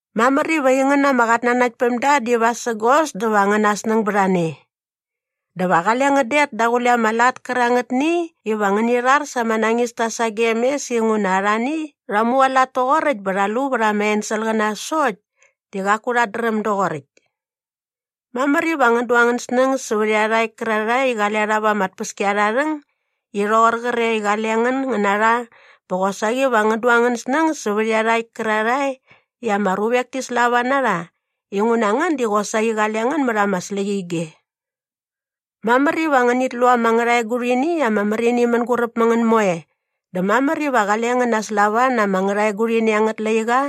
Mamär iva aingän ama qatnanaktpämda di vasägos dä va angäna snäng bät a ne. Dä va qale ngän det daqule ama lat kärangätni iva ngäni rhar sa ama nañista sagem mes inguna arhani rha mualat toqoräkt bä sa rha lu vät ama enselqäna sokt di qaku rhat dräm doqoräkt. Mamär iva ngän du angän snäng sävät iarhakt kärarhae i qale rha va ama tpäskiarharhäng i rhoqor qre i qale ngän ngän na rha bä qosaqi va ngän du angän snäng sävät iarhakt kärarhae i ama ruvek ti slava na rha inguna ngän di qosaqi qale ngän mät ama släqyige. Mamär iva ngänit lu ama ngärhaegurhini i ama märini mänguräp mä ngän moe dä mamär iva qale ngän naslava na ama ngärhaegurhini angät laiqa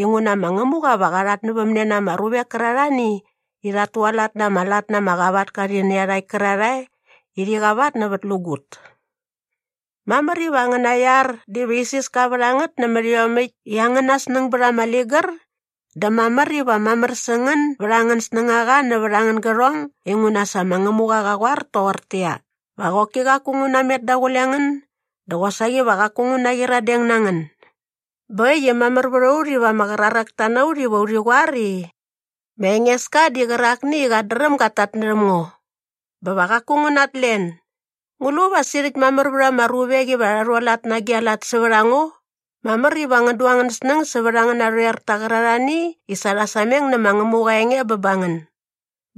inguna ma Ngämuqa va qa rhatnävämne na ama ruvek kärarhani i rhat tualat na ama lat na ama qavatka rhi nä iarhakt kärarhae i rhi qavatnävätlägut. Mamär iva angäna iar diva isiska vät a ngät nämät iomäkt i angäna snäng bät ama ligär dä mamär iva mamär sä ngän bät angän snängaqa nävät angän gärhong inguna sa ma Ngämuqa qa qoar toqortäqyia, “Va qoki qaku ngu namet daqule ngän dä qosaqi va qaku ngu naqyiradeng na ngän.” Bä äkt i mamär vät a ut iva ama qraräkta na ut iva urhi qoar i, “Ma Engeska di qärakni i qat dräm gat tatnärhäm ngo. Bä va qaku ngu natlen. Ngu lu va sirhäkt mamär vät ama ruvek iva rha rhualat na agi a lat sävät a ngo?” Mamär iva ngän du angän snäng sävät angän narhoerta qärarhani i sa rha sameng nä ma Ngämuqa aa enge bä ba ngän.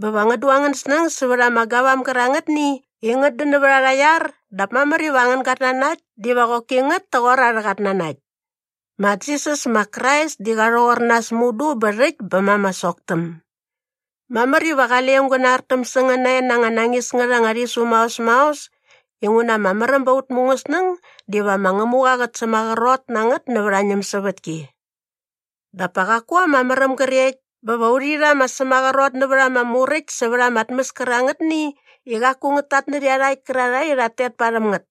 Bä va ngän du angän snäng sävät ama gavam gärangätni i ngät dän nävät arha iar dap mamär iva angän gatnanakt diva qoki ngät toqor arhä qatnanakt. Ma Jisas ma Krais di qa rhoqor nas mudu bä rhäkt bä ma ama soktäm. Mamär iva qale aung gä nartäm sä ngän nae na anga nañis ngät anga rhisu maos maos inguna ama märäm bä ba aut mungäsnäng diva ma Ngämuqa qät sämaqrot na ngät nävät aa ñämsävätki. Dap pa qaku ama märäm grekt bä va urhi rha ama sämaqrot nävät ama muräkt sävät ama tmäs kärangätni i qaku ngät tatnärhä iarhakt kärarhae i rhat tet parhäm ngät.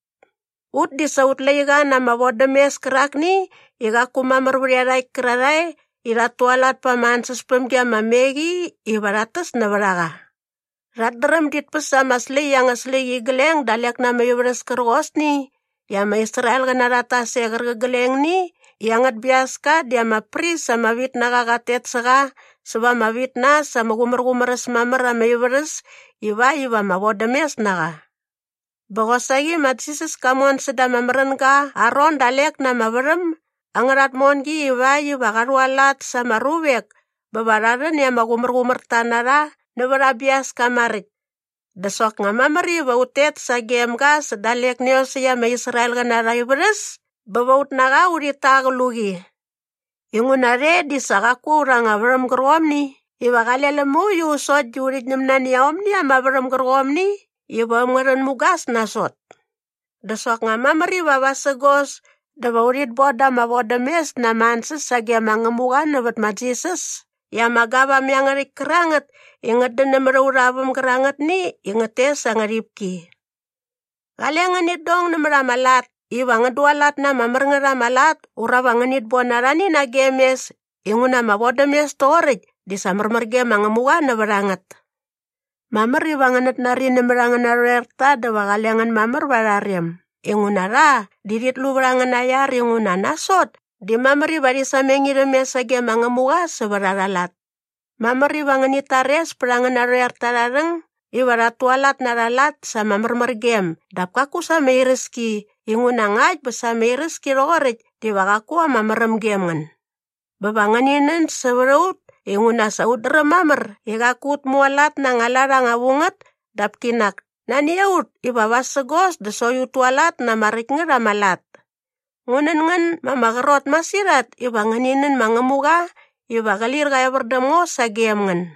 Ut di sa aut laiqa na ama vodämes kärakni i qaku mamär vät iarhakt kärarhae i rhat tualat pa ama ansäspämgi ama me qi iva rhat täs nävät a qa. Rhat dräm dit päs ama släkt angärha släqyigleng dalek na ama ivärhäs kärqosni i ama Israelqäna rhat tas e qärqiglengni i angät biaska di ama pris ama vit na qa qat tet sä qa säva ama vit na äs ama qumärqumär äs mamär ama ivärhäs ivakt iva ama vodämes na qa. Bä qosaqi ma Jisas ka mon säda ama märänga aa ron dalek na ama värhäm angärha tmongi ivakt iva qa rhualat sa ama ruvek bä va rha rhän i ama qumärqumärta na rha nävät aa biaska maräkt. Dä soknga mamär iva ut tet sagem ga sä dalek nä iosäkt ama Israelqäna arha ivärhäs bä va ut na qa urhit ta aa qluqi. Inguna rhe di sa qaku aurha anga värhäm gärqomni iva qale läm mauiu sokt di urhit ñäm nani aomni ama värhäm gärqomni iva äm ngä rhän mugas nasot. Dä soknga mamär iva vasägos dä va urhit boda ama vodämes na ama ansäs sage ma Ngämuqa nävät ma Jisas i ama gavam iangärhäkt kärangät i ngät dän nämät aurha väm gärangätni i ngät tes aa ngärhipki. Qale ngänit dong nämät ama lat iva ngän dualat na ama mär ngät ama lat ura va ngänit bon arhani nagem mes inguna ama vodämes toqoräkt di sa märmär ge ma Ngämuqa nävät a ngät. Mamär iva ngänät nari nämät angän narhoerta dä va qale ngän mamär va arha rem inguna rha di rhit lu vät angäna iar inguna nasot di mamär iva rhi sameng irhäm mes sage ma Ngämuqa sävät arha lat. Mamär iva ngänit tares pät angän narhoerta arha rhäng iva rhat tualat na arha lat sa ama märmärgem dap kaku sa ama iräski inguna ngakt bä sa ama iräski rhoqoräkt diva qaku ama märäm gem ngän. Bä va ngäni nän sävät a ut inguna sa ut dräm mamär i qaku ut mualat na anga lat anga vu ngät dap kinak nani a ut iva vasägos dä sokt ut tualat na ama räkt ngät ama lat. Ngu nän ngän ma ama qrot masirhat iva ngäni nän ma Ngämuqa iva qä lir qä evär däm ngo sagem ngän.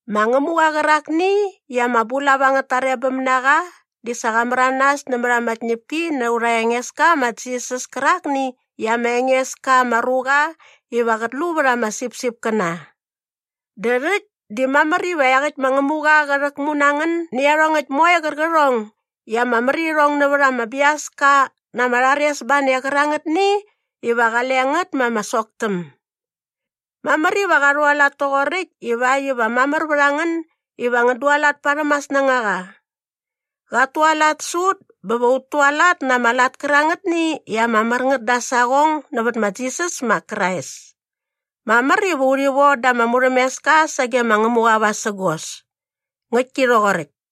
Ma Ngämuqa qärakni i ama bulap angät tarebäm na qa di sa qa märanas nämät ama tñäpki na aurha Engeska ma Jisas kärakni i ama enges ka ama ruqa iva qät lu vät ama sipsipkäna. Dä rhäkt di mamär iva iaqäkt ma Ngämuqa qä rhäkmu na ngän nä iarhongäkt moe qärqärhong i ama mär irhong nävät ama biaska na ama rharesbane qärangätni iva qale ngät ma ama soktäm. Mamär iva qa rhualat toqoräkt ivakt iva mamär vät a ngän iva ngän dualat parhäm aa snängaqa. Qat tualat sä ut bä va ut tualat na ama lat kärangätni i ama mär ngät da aa saqong nävät ma Jisas ma Krais. Mamär iva urhi von da ama murhämeska sagem ma Ngämuqa vasägos. Ngäktki rhoqoräkt.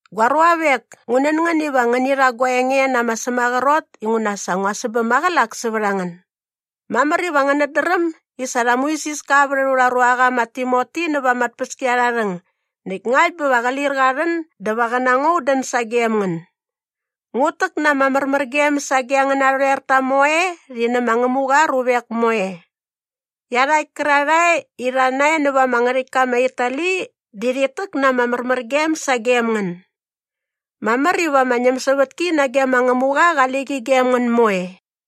Gua ruavek, ngu nän ngän iva ngäni rha gua enge na ama sämaqrot inguna sa ngua sämbäm maqälak sävät a ngän. Mamär iva ngänät dräm i sa rha muisiska vät aurha ruaqa ma Timoti näva ama tpäskiarharhäng näkt ngakt bä va qä lir qa rhän dä va qä na ngo un dän sagem ngän. Ngut täk na ama märmärgem sage angän narhoerta moe rhi nä ma Ngämuqa aa ruvek moe. Iarhakt kärarhae i rha nae näva ama ngärhäktka ma Itali di rhit täk na ama märmärgem sagem ngän. Mamär iva ama ñämsävätki nage ma Ngämuqa qali qi gem ngän moe.